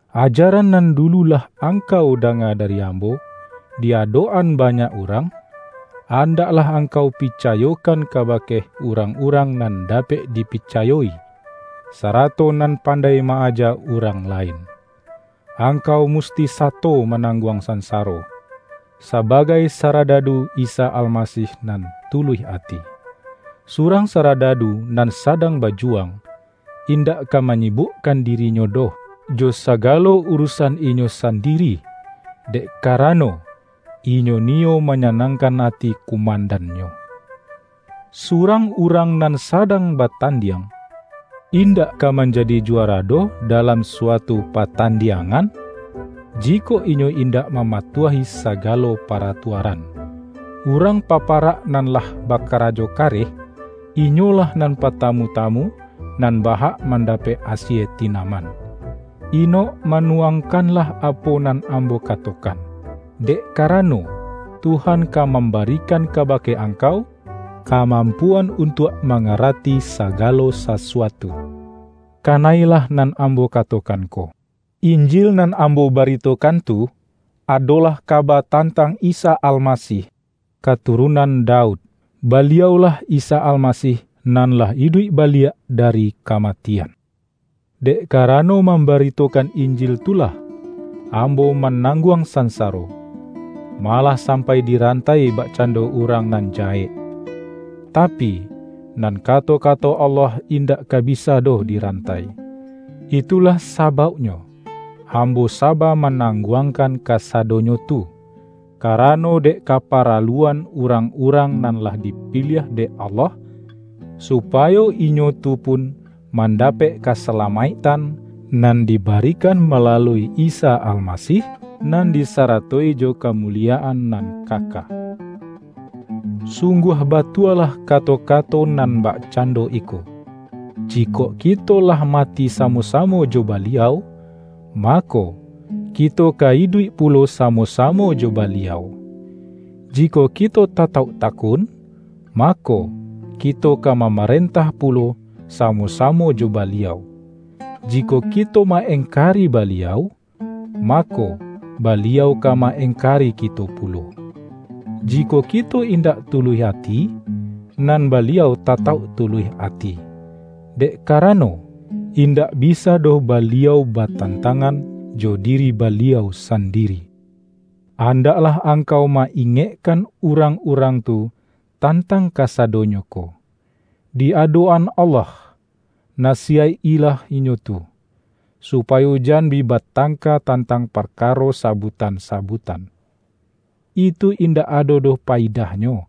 Ajaran nan dulu lah angkau danga dari ambo di adok-an banyak urang, andaklah angkau picayokan kabake urang-urang nan dapek dipicayo-i, sa-rato nan pandai ma-aja urang lain. Angkau musti sato manangguang sansaro, sabagai saradadu Isa Almasih nan tuluih ati. Surang saradadu nan sadang bajuwang, indak ka ma-nyibukkan dirinyo doh, jo sagalo uru-san inyo sandiri, dek karano, inyo ni-yo manyanangkan ati kumandannyo. Surang urang nan sadang batan-diang, indak ka manjadi juara doh dalam suatu patandiangan, jikok inyo indak mamatuahi sagalo paratua-ran. Urang paparak nan lah bakara-jo kareh, inyolah nan partamu-tamu nan ba-hak mandapek asie tinaman. Inok-manuangkanlah apo nan ambo katokan, dek karano, Tuhan ka mam-barikan kabake angkau, kamampuan untuak mangarati sagalo sasuatu. Kana-ilah nan ambo katokan ko: Injil nan ambo baritokan tu, adolah kaba tan-tang Isa Almasih, katurunan Daud; Baliau-lah Isa Almasih nan lah iduik baliak da-ri kamatian. Dek karano mambaritokan Injil tu lah, ambo manangguang sansaro; malah sampai dirantai bakcando urang nan jahek. Tapi, nan kato-kato Allah indak ka bisa doh dirantai. Itulah sabauknyo ambo saba manangguangkan kasadonyo tu, karano dek kaparaluan urang-urang nan lah dipiliah dek Allah, supayo inyo tu pun mandapek kasalamaiktan, nan diba-rikan malalui Isa Almasih, nan disaratoi jo kamuliyaan nan kaka. Sungguah batua-lah kato-kato nan bakcando iko,”Jikok kito lah mati samo-samo jo Baliau, mako, kito ka iduik pulo samo-samo jo Baliau. Jikok kito tatauk takun, mako, kito ka mamarentah pulo samo-samo jo Baliau. Jikok kito ma-engkari Baliau, mako, Baliau ka ma-engkari kito pulo. Jikok kito indak tuluih ati, nan Baliau tatauk tuluih ati, dek karano, indak bisa doh Baliau batantangan jo diri Baliau sandiri.” Andaklah angkau ma-ingekkan urang-urang tu tantang kasadonyo ko. Di adok-an Allah, nasiyaik-ilah inyo tu, supayo jan bi batangka tan-tang parkaro sabutan-sabutan. Itu in-dak ado doh payidahnyo,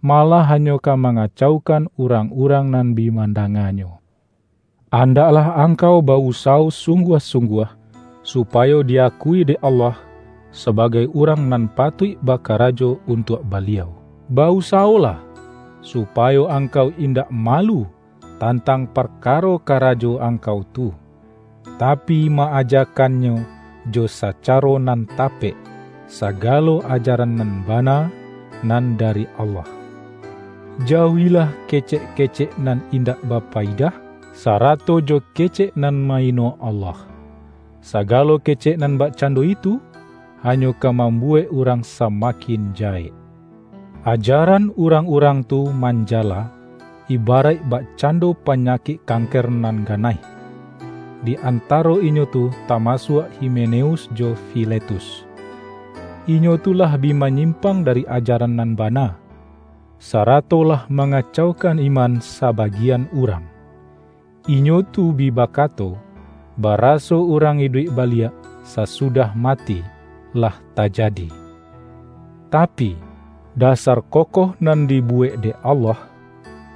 malah ha-nyo ka mangacaukan urang-urang nan bi mandanganyo. Andaklah angkau ba-usawo sungguah-sungguah, supayo di-akui dek Allah sabagai urang nan patuik bakarajo untuak Baliau. Ba-usawolah, supayo angkau indak malu tantang parkaro karajo angkau tu, ta-pi, ma-ajakannyo jo sacaro nan tapek, sagalo ajaran nan bana nan dari Allah. Jauahilah kecek-kecek nan indak bapayidah, sarato jo kecek nan ma-ino Allah. Sagalo kecek nan bakcando itu, hanyo ka mambuwek urang samakin jahek. Ajaran urang-urang tu man-jala, ibaraik bakcando panyakik kan-ker nan ganaih. Di antaro inyo tu ta-masuak Himeneus jo Filetus. Inyo tu lah bi manyimpang dari ajaran nan bana, sarato lah mangacaukan iman sabagian urang. Inyo tu bi bakato, ba-raso urang iduik baliak sasudah ma-ti, lah tajadi. Tapi, dasar kokoh nan dibuwek dek Allah,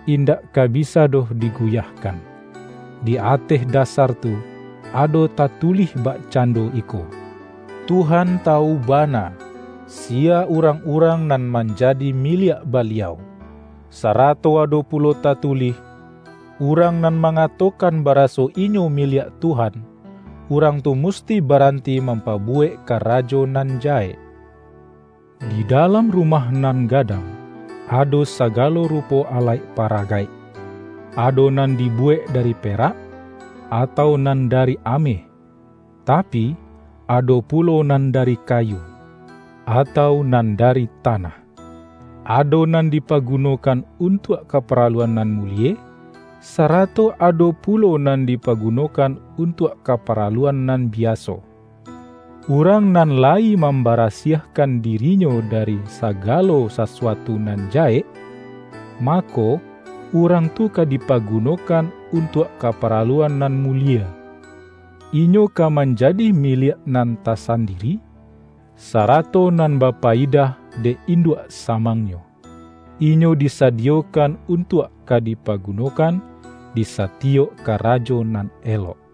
indak ka bisa doh diguyahkan. Di ateh dasar tu ado ta-tulih bakcando iko,”Tuhan tawu ba-na, siya urang-urang nan manjadi mi-liak Baliau”, sarato ado pulo tatulih,”Urang nan mangatokan baraso inyo miliak Tuhan, urang tu musti baranti mampabuwek karajo nan jahek”. Di dalam rumah nan gadang ado sagalo rupo alaik paragaik. Ado nan di-buwek dari perak, atau nan dari ameh, tapi, ado pulo nan dari kayu, atau nan dari tanah. Ado nan dipagunokan un-tuak kaparaluan nan mulie, sarato ado pulo nan dipagunokan untuak kapara-luan nan biaso. Urang nan layi mam-barasiahkan dirinyo dari sagalo sasuatu nan jahek, mako, urang tu ka dipaguno-kan untuak kaparaluan nan mulie. Inyo ka manjadi miliak nan tasandiri, sarato nan bapayidah dek induak samangnyo. Inyo disadiyokan untuak ka dipaguno-kan di satiyok karajo nan elok.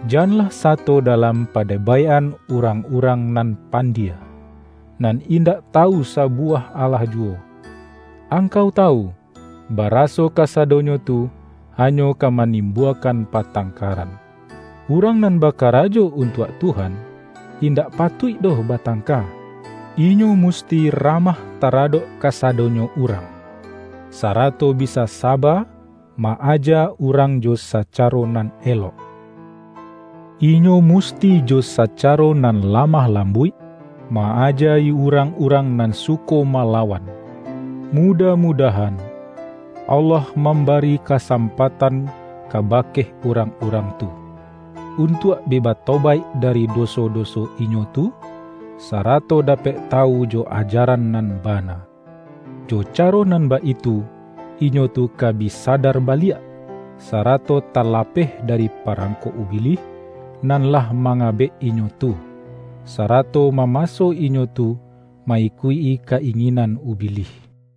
Janlah sato dalam padebaik-an urang-urang nan pandie, nan indak tawu sabuwah alah juwo. Angkau ta-wu, baraso kasadonyo tu hanyo ka ma-nimbuakan patangkaran. Urang nan bakara jo untuak Tuhan, indak patuik doh batangka; inyo musti ramah tara-dok kasadonyo urang, sarato bisa saba ma-aja urang jo sacaro nan elok. Inyo musti jo sacaro nan lamah lambuik, ma-aja-i urang-urang nan suko malawan; mudah-mudahan, Allah mambari ka-sampatan kabake urang-urang tu, un-tuak bi batobaik dari doso-doso inyo tu, sarato dapek tawu jo ajaran nan bana. Jo caro nan baitu, inyo tu ka bi sadar baliak, sarato talapeh dari parangkok Ubilih nan lah mangabek inyo tu, sara-to mamaso inyo tu ma-ikuik-i ka-ingin-an Ubilih.